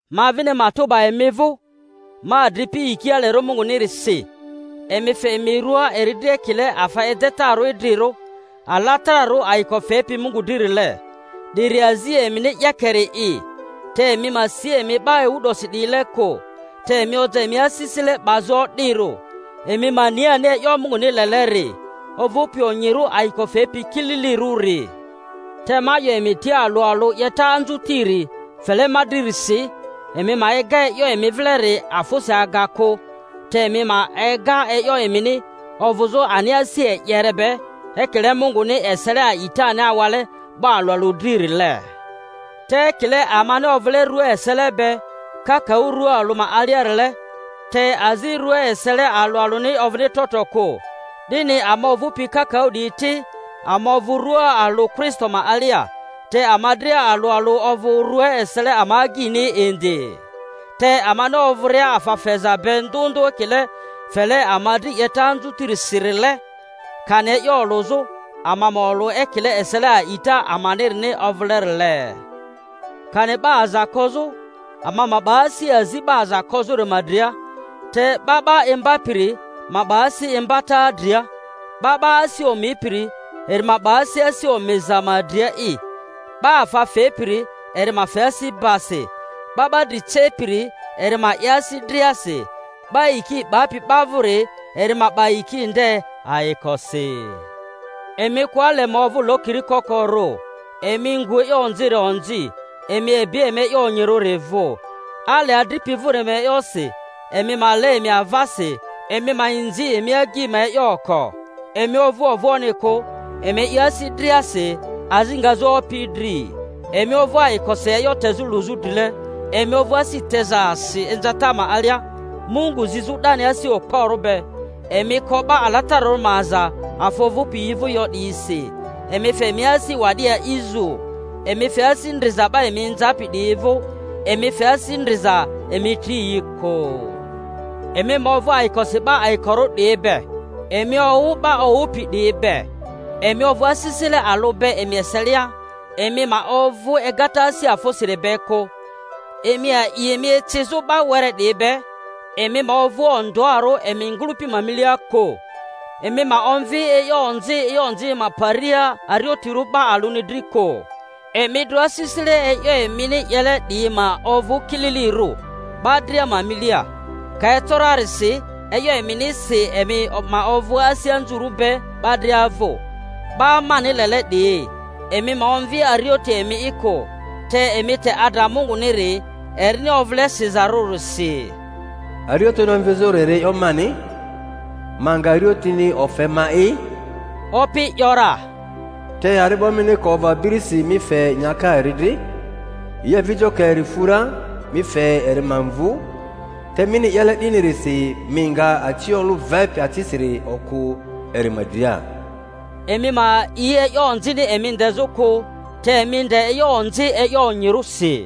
Ma vini matᴜ 'ba emi vᴜ, ma adripi, yiki alerᴜ Mungunirisi, emi fe emi rua eri dri ekile afa edetarᴜ idrirᴜ, alatararᴜ, ayiko fepi Mungu dririle; 'diri azi emini 'yeke-ri'i. Te emi ma si emi 'ba ewu 'dosi 'diyile kᴜ, te emi oja emi asisile 'bazᴜ o'dirᴜ, emi ma ni ani e'yo Munguni leleri, ovᴜpi onyirᴜ, ayiko fepi, kililirᴜri. Te ma 'yo emi tia alᴜ alᴜ, 'yeta anzutiri fele ma dririsi, emi ma ega e'yo emi vileri afᴜsi aga kᴜ, te emi ma ega e'yo emini ovᴜzᴜ ani asi e'yere be, ekile Munguni esele a'itani awale 'ba alᴜ alᴜ dririle. Te ekile amani ovᴜle rua esele be kakaᴜ rua alᴜ ma aliarile, te azi rua esele alᴜ alᴜni ovᴜni trotro kᴜ, 'dini ama ovᴜpi kakaᴜ 'diyi ti, ama ovᴜ rua alᴜ Kristo ma alia, te ama dria alᴜ alᴜ ovᴜ rua esele ama agyini indi. Te amani ovᴜria afa feza be ndᴜ ndᴜ ekile fele ama dri 'yeta anzutirisirile, kani e'yo olᴜzᴜ, ama ma olᴜ ekile esele a'ita amanirini ovᴜlerile; kani 'ba aza kozᴜ, ama ma 'ba asi azi 'ba aza kozᴜri ma dria; te 'ba 'ba imbapiri ma 'ba asi imbata dria; 'ba 'ba asi omipiri, eri ma 'ba asi asi omiza ma dria'i; 'ba afa fepiri, eri ma fe asi basi; 'ba 'ba dri cepiri, eri ma 'ye asi driasi; 'ba yiki 'bapi 'ba vᴜri, eri ma 'ba yiki nde ayikosi. Emi kᴜ ale ma ovᴜ lokiri koko-rᴜ; emi ngu e'yo onziri onzi, emi ebi emi e'yo onyirᴜri vᴜ; ale adripi vᴜri ma e'yosi emi ma le emi avasi; emi ma inzi emi ma agyi ma e'yo oko. Emi ovᴜ ovᴜoᴜni kᴜ, emi 'ye e'yo asi driasi, azi ngazᴜ Opi dri. Emi ovᴜ ayikosi e'yo tezᴜ luzᴜ drile, emi ovᴜ asi tezasi inzata ma alia, Mungu zizᴜ 'dani asi okporᴜ be. Emi ko 'ba alatararᴜ ma aza afa ovᴜpi yi vᴜ yo 'diyisi, emi fe emi asi wa'di a'fzᴜ. Emi fe asi ndriza 'ba emi inzapi 'diyi vᴜ; emi fe asi ndriza, emi tri yi kᴜ. Emi ma ovᴜ ayikosi 'ba ayikorᴜ 'diyi be, emi owᴜ 'ba owᴜpi 'diyi be. Emi ovᴜ asisile alᴜ be emi eselia; emi ma ovᴜ egata asi afᴜsiri be kᴜ, emi a'i emi ecizᴜ 'ba were 'diyi be; emi ma ovᴜ ondᴜarᴜ emi ma ngᴜlᴜpi ma milia kᴜ. Emi ma omvi onzi e'yo onzi ma paria ariotirᴜ 'ba alᴜni dri kᴜ. Emi dro asisile e'yo emini 'yele 'diyi ma ovᴜ kililirᴜ 'ba dria ma milia. Ka eco rarisi, e'yo eminisi emi ma ovᴜ asi anzurᴜ be 'ba dria vᴜ. 'Ba mani lele 'diyi, emi ma omvi arioti emi'i kᴜ, te emi te adra Munguniri, erini ovᴜle sizarᴜrisi, Arioti omvizᴜri e'yoni mani, ma nga ariotini ofe ma'i, Opi 'yo ra. Te ari'bo mini ka ovᴜ abirisi mi fe nyaka eri dri, yi avijo ka eri fu ra mi fe eri ma mvu; te mini 'yele 'dinirisi mi nga aciolᴜ vepi acisiri okᴜ eri ma dria. Emi ma a'i e'yo onzini emi ndezᴜ kᴜ, te emi nde e'yo onzi e'yo onyirᴜsi.